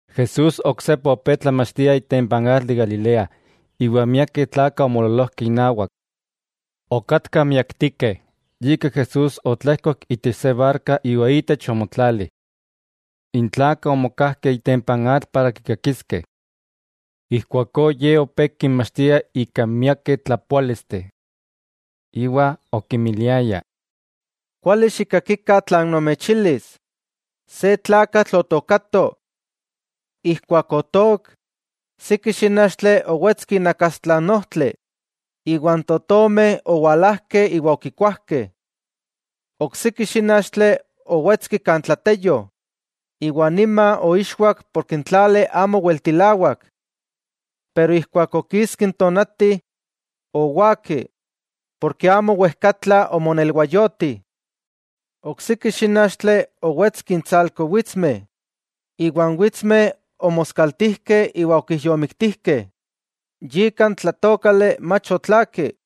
Jesús oksepa opé tlamachtia itempa n atl de Galilea, iwa miakeh tlakah omoololojkeh inawak. Okatkah miaktikeh, yika Jesús otlejkok itech se barka iwa itech omotlali. N tlakah omokajkeh itempa n atl para kikakiskeh. Ijkuakó Ye opé kinmachtia ika miakeh tlapoálisteh. Iwa okinmiliaya: —Kuali xikakikah tlan nomechilis: Se tlakatl otookato. Ijkuak otook, siki xínachtli owetski inakastla n ojtli, iwa n totomeh owalajkeh iwa okikuajkeh. Oksiki xínachtli owetski kan tlateyo iwa niman oixwak porke n tlali amo weltilawak. Pero ijkuak okiski n tonati, owaki, porke amo wejkatla omonelwayoti. Oksiki xínachtli owetski intsalko witsmeh, iwa n witsmeh omoskaltijkeh iwa okijyomiktijkeh, yika n tlatookali mach otlaaki.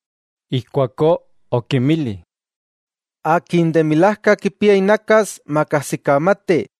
Ijkuakó okinmili: —¡Akin de milajka kipia inakas, makajsikamati!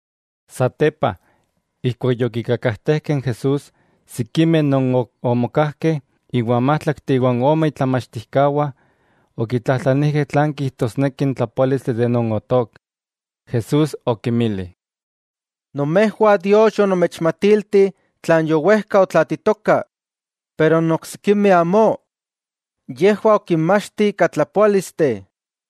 Satepa, ijkuak yokikakajtejkah n Jesús, sikimeh non ok omokajkeh iwan májtlakteh iwa ome itlamachtijkawah, okitlajtlanijkeh tlan kijtosneki n tlapoálistli de non otook. Jesús okinmili: —Nomejwah Dios yonomechmatilti tlan yowejkah otlaatitokah, pero n oksikimeh amó. Yejwah okinmachti ika tlapoálisteh.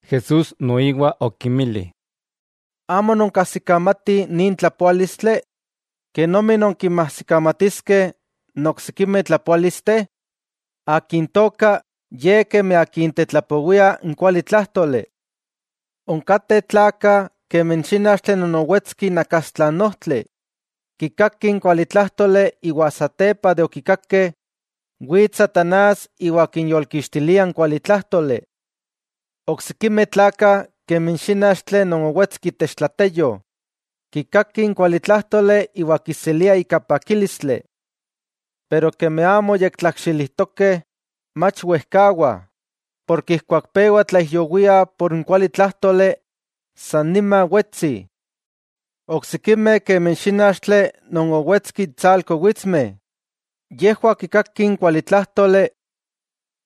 Jesús noiwa okinmili: —¿Amo nonkajsikamatih nin tlapoálistli? ¿Kenomi nonkinmajsikamatiskeh n oksikimeh tlapoálisteh? Akin tooka ye kemi akin tetlapowia n kualitlájtoli. Onkateh tlakah kemi n xínachtli non owetski inakastla n ojtli, kikakih n kualitlájtoli iwa keman okikakeh, wits satanás iwa kinyolkixtilia n kualitlájtoli. Oksikimeh tlakah kemi n xínachtli non owetski itech tlateyo, kikakih n kualitlájtoli iwa kiseliah ika pakílistli. Pero kemi amo yektlakxilitokeh, mach wejkawah, porke ijkuak pewa tlaijyowiah por n kualitlájtoli, san nima wetsih. Oksikimeh kemi n xínachtli non owetski itsalko witsmeh, yejwah kikakih n kualitlájtoli,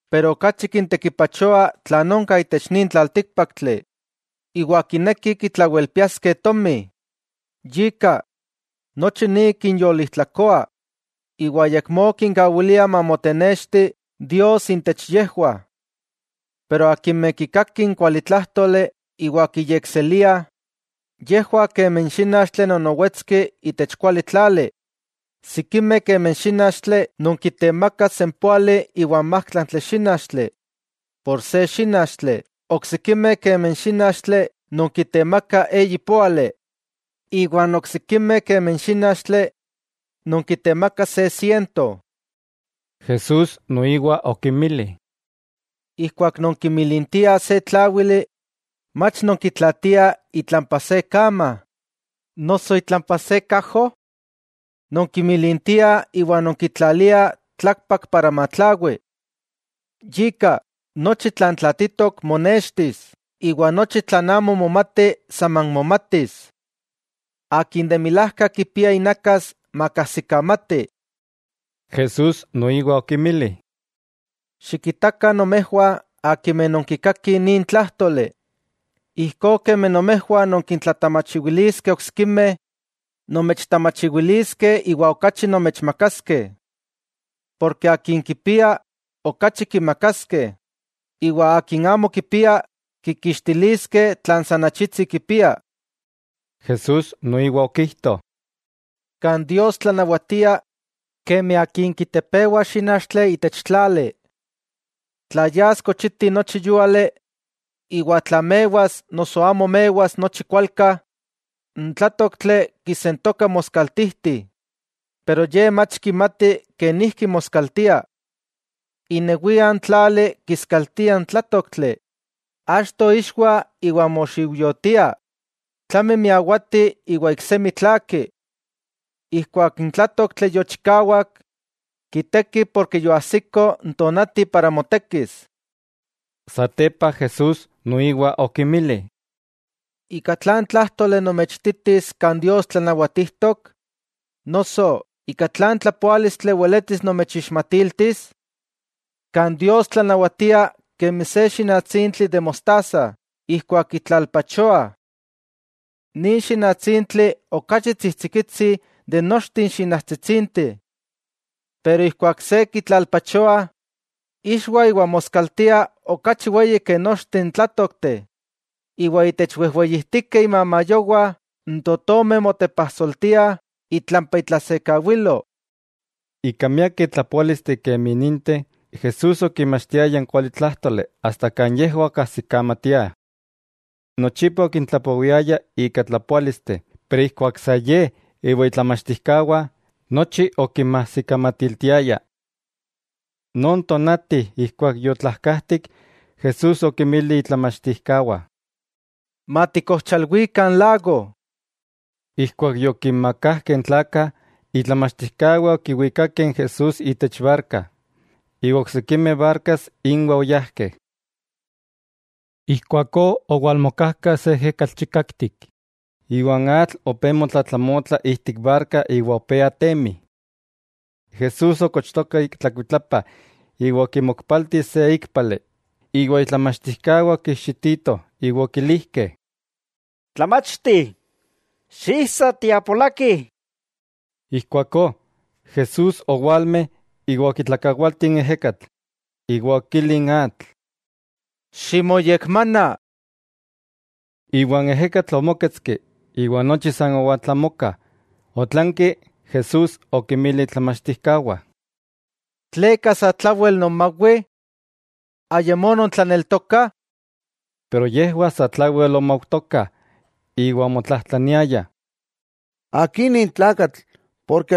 pero okachi kintekipachoa tlan onka itech nin tlaltíkpaktli, iwa kinekih kitlawelpiaskeh tomi. Yika, nochi ni kinyolijtlakoa iwa ayakmó kinkawilia mamotenexti Dios intech yejwah. Pero akimeh kikakih n kualitlájtoli iwa kiyekseliah, yejwah kemi n xínachtli non owetski itech kuali tlali, sikimeh kemi n xínachtli non kitemakah sempóali iwa n májtlaktli xínachtli por se xínachtli, oksikimeh kemi n xínachtli non kitemaka eyi póali, iwa n oksikimeh kemi n xínachtli non kitemaka se siento. Jesús noiwa okinmili: —Ijkuak nonkimilintiah se tláwili, ¿mach nonkitlaatiah itlampa se kama noso itlampa se kajo? Nonkimilintiah iwa nonkitlaliah tlakpak para matlawi. Yika, nochi tlan tlaatitok monextis iwa nochi tlan amo momati saman momatis. ¡Akin de milajka kipia inakas, makajsikamati! Jesús noiwa okinmili: —Xikitakah nomejwah akimeh nonkikakih nin tlájtoli. Ijkó kemi nomejwah nonkintlatamachiwiliskeh oksikimeh, nomechtamachiwiliskeh iwa okachi nomechmakaskeh. Porke akin kipia, okachi kimakaskeh, iwa akin amo kipia, kikixtiliskeh tlan san achitsi kipia. Jesús noiwa okijto: —Kan Dios tlanawatia, kemi akin kitepewa xínachtli itech tlali. Tla yas kochiti nochi yúali, iwa tla mewas noso amo mewas nochi kualka, n tlátoktli kisentoka moskaltijti, pero ye mach kimati kenijki moskaltia. Inewia n tlali kiskaltia n tlátoktli, achto ixwa iwa moxiujyotia, tlami miawati iwa iksemi tlaaki. Ijkuak n tlátoktli yochikawak, kitekih porke yoajsiko n tonati para motekis. Satepa Jesús noiwa okinmili: —¿Ika tlan tlájtoli nomechititis kan Dios tlanawatijtok? Noso, ¿ika tlan tlapoálistli weletis nomechixmatiltis? Kan Dios tlanawatia kemi se xinatsintli de mostaza ijkuak kitlalpachoah. Nin xinatsintli okachi tsijtsikitsi de nochteh n xinachtsitsinteh. Pero, ijkuak se kitlalpachoa, ixwa iwa moskaltia okachi weyi ke nochteh n tlátokteh, iwa itech wejweyijtikeh imamayowah n totomeh motepajsoltiah itlampa itlasekawilo. Ika miakeh tlapoálisteh Jesús okinmachtiaya n kualitlájtoli asta kan yejwah okajsikamatiah. Nochipa okintlapowiayah ika tlapoálisteh, pero ijkuak sa Ye omokawaya iwan itlamachtijkawah, nochi okinmajsikamatiltiaya. Non tonati ijkuak yotlajkajtik Jesús okinmili itlamachtijkawah: —Matikojchalwikah n lago. Ijkuak yokinmakajkeh n tlakah, itlamachtijkawah okiwikakeh n Jesús itech barka, iwa oksikimeh barkas inwah oyajkeh. Ijkuakó owalmokajka se ejekatl chikaktik iwa n atl opé motlatlamotla ijtik barka iwa opé atemi. Jesús okochtoka tlakuitlapa iwa okimokpalti se íkpali, iwa itlamachtijkawah okijxititoh iwa okilijkeh: —¡Tlamachti! ¡Xiijsa, tiapolakih! Ijkuakó Jesús owalme iwa okitlakawalti n ejekatl, iwa okili n atl: —¡Ximoyekmana! Iwa n ejekatl omóketski iwa nochi san owaltlamoka. Otlanki Jesús okinmili itlamachtijkawah: —¿Tleka satlawel nonmawih? ¡Ayamó nontlaneltokah! Pero yejwah satlawel omaujtokah iwa omotlajtlaniayah. —¿Akin nin tlakatl,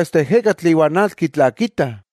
asta n ejekatl iwa n atl kitlakitah?